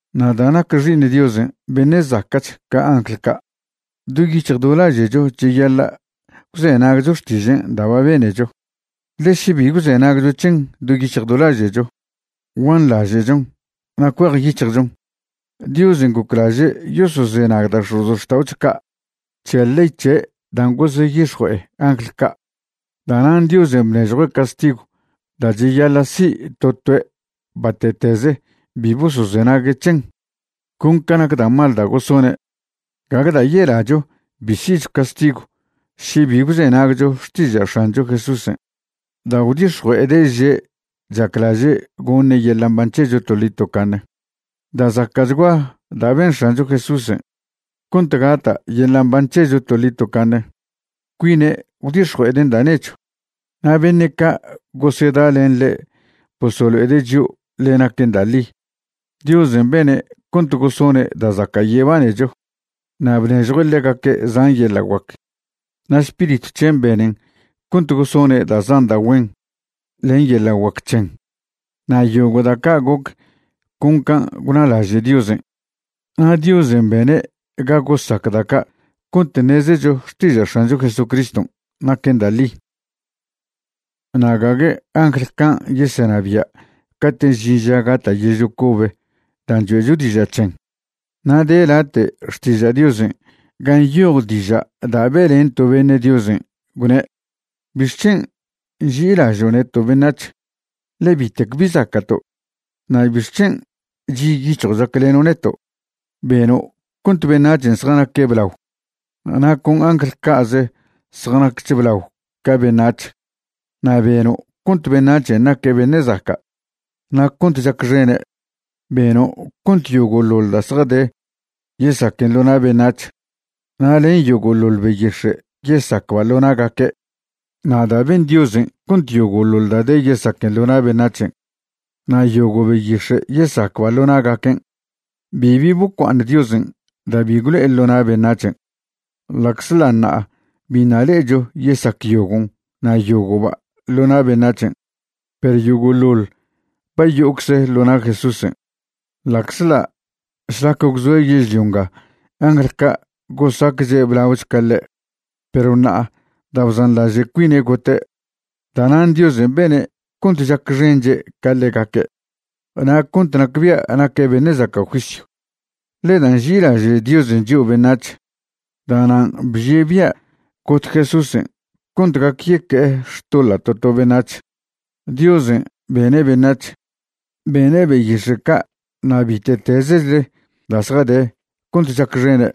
Na' da' nac Xi'iṉ Diosen' beṉe' zaca'ch ca angl ca', do yic̱hj do laže'cho cheyaḻa' gwzenagcho xtižen' da' ba benecho. Ḻe še bi gwzenagcho c̱hen do yic̱hj do laže'cho, guanḻaže'chon na' cuejyic̱hjchon. Diosen' goclaže' yosozenag da' x̱ozxta'ocho ca' c̱he ley c̱he' dan' goseyix̱jue'e angl ca'. Da'nan' Diosen' bnežjue' castigw da' cheyaḻa' si' to toe' bate'tez bi bosozenague' c̱hen, con ca nac da' mal da' gosone'. Gague da' yelacho bi si'cho castigw še bi gwzenagcho xtiža' X̱ancho Jesúsen' da' gwdix̱jue'ede' že' chaclaže' goṉe' yeḻa' mban c̱hecho toḻi tocaṉe. Da' zaca'chgua da' ben X̱ancho Jesúsen' cont gata' yeḻa' mban c̱hecho toḻi tocaṉe. Cuine' gwdix̱jue'eden' da' nechw, na' beṉe' ca' gosedalen ḻe' bosolo'ede' chio' ḻe naquen da' ḻi. Diosen' bene' cont gosone' da' zaca' yebanecho, na' bnežjue' ḻegaque' zan yeḻa' guac, na' Spiritw c̱hen' benen cont gosone' da' zan da' güen len yela' guac c̱hen. Na' yogo' da' ca' goc con can' gwnalaže' Diosen'. Na' Diosen' bene' ga gosac da' ca' cont ṉezecho xtiža' X̱ancho Jesuscriston' naquen da' ḻi. Na' gague angl can' yesenabia' cate' žin ža gata' yežlio cobe dan' choe'cho diža' c̱hen. Na' de late' Xtiža' Diosen' gan' nyoj diža' da' be'len to beṉe' Diosen', gwne': ¿Bixc̱hen' nži'ilažo' neto' beṉac̱h? ḻe bitec bi zaca'to'. Na' ¿bixc̱hen' chi' yic̱hjo' chacleno' neto'? Beno' cont beṉac̱hen' zjanaque' blao, na' con angl ca'ze zjanaquech blao ca beṉac̱h. Na' beno' cont beṉac̱hen' naque' beṉe' zaca' na' cont chacxene'. Beno' cont yogo'ḻoḻ da' zjade yesaquen ḻo na' beṉac̱h, na' len yogo'ḻoḻ beyix̱e' yesacba' ḻo na'gaque'. Na' da' ben Diosen' cont yogo'ḻoḻ da' de yesaquen ḻo na' beṉac̱hen' na' yogo' beyix̱e' yesacba' ḻo na'gaquen', bibi bocua'aṉ Diosen' da' bi gwlo'e ḻo na' beṉac̱hen', ḻa'czḻa' ṉa'a biṉa' le'echo yesac yogon' na' yogo'ba' ḻo na' beṉac̱hen'. Perw yogo'ḻoḻ ba yo'ocze ḻo na' Jesúsen', ḻa'czḻa' šlac gwzoe' yežlio nga angl ca' gosacche' blaoch ca ḻe'. Perw ṉa'a da' bzanḻaže' cuine' gote', da'nan' Diosen' bene' cont chacxenche' ca ḻegaque' na' cont nacbia' naque' beṉe' zaca' juisyw. Ḻe da' nži'ilaže' Diosen' chio' beṉac̱h, da'nan' bžie' bia' got Jesúsen' cont gac yeque'e xtoḻa' to to beṉac̱h. Diosen' bene' beṉac̱h, bene' beyix̱e' ca' na' bite'tezechle da' zjade cont chacxene'.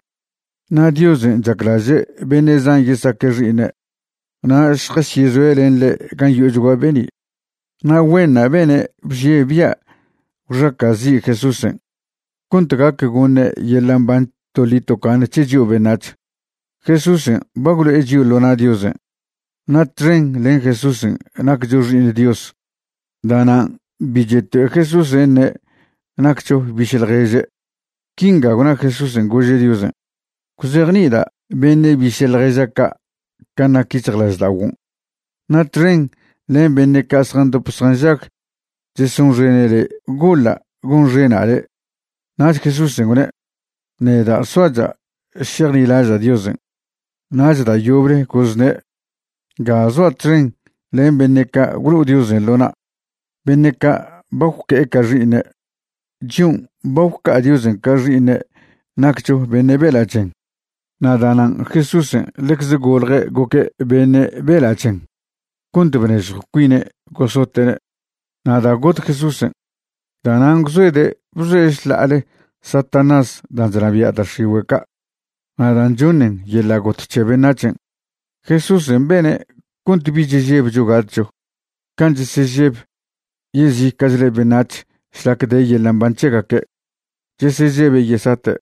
Na' Diosen' chaclaže' beṉe' zan yesaque' xi'iṉe' na' šjasyezoe' len ḻe' gan' yo'ochgua be'ni', na' güenṉa' bene' bžie' bia' gwxaca'zi' Jesúsen' cont gac goṉe' yeḻa' mban toḻi tocaṉe c̱he chio' beṉac̱h. Jesúsen' ba gwlo'e chio' ḻo na' Diosen' na' txen len Jesúsen' naccho xi'iṉ Dios. Da'nan' bi cheto'e Jesúsen' ṉe' naccho biše' ḻježe'. Quinga gwna Jesúsen' gože' Diosen': Gwzejni'ida' beṉe' biše' ḻježa' ca' can' nac yic̱hjlažda'oguon', na' txen len beṉe' ca' zjandop zjanžag chesonxene' le' goḻa' gonxena' le'. Nach Jesúsen' gwne': Neda' soacha' šejnilaža' Diosen'. Nach da' yoble gozne': Nga zoa' txen len beṉe' ca' gwlo'o Diosen' ḻo na', beṉe' ca' ba gwque'e ca xi'iṉe'. Chion' ba gwca'a Diosen' ca xi'iṉe' naccho beṉe' bela' chen, na' da'nan' Jesúsen' ḻecze golje' goque' beṉe' bela' chen cont bnežjo cuine' gosote'ne'. Na' da' got Jesúsen', da'nan' gwzoede' bzoe' šḻa'ale Satanás dan' chnabia' da' x̱igüe' ca' na' dan' choṉen yeḻa' got c̱he beṉac̱hen'. Jesúsen' bene' cont bich chžebcho gatcho, can' chesežeb yezica'chle beṉac̱h šlac de yeḻa' mban c̱hegaque', chesežebe' yesate'.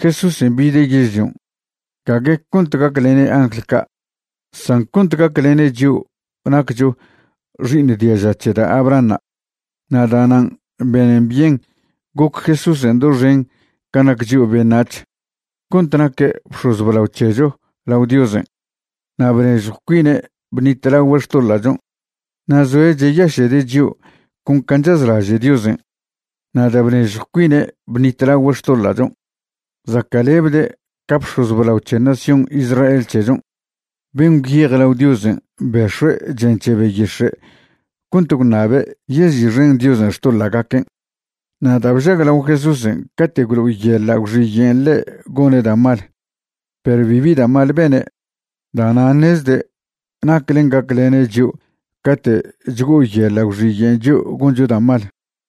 Jesúsen' bide' yežlion', gague cont gaclene' angl ca', san cont goclene' chio' naccho xi'iṉ diaža c̱he da' Abrahanṉa'. Na' da'nan' benen byen goc Jesúsen' doxen can' nac chio' beṉac̱h cont naque' bx̱oz blao c̱hecho lao Diosen'. Na' bnežjw cuine' bṉitlagüe' xtoḻa'chon' na' zoe' cheyaše'de' chio' con can' chazlaže' Diosen'. Na' da' bnežjw cuine' bṉitlagüe' xtoḻa'chon', zaca'lebde' ca bx̱oz blao c̱he nación Israel c̱hechon' ben' gwyej lao Diosen' bex̱ue' chen c̱he beyix̱e' cont gwṉabe' yezi'xen Diosen' xtoḻa'gaquen'. Na' da' bžaglao Jesúsen' cate' gwlo'oyeḻa' gwxiyen' ḻe' gone' da' mal, perw bibi da' mal bene', da'nan' ṉezde' naclen' gaclene' chio' cate' chgo'oyeḻa' gwxiyen' chio' goncho da' mal.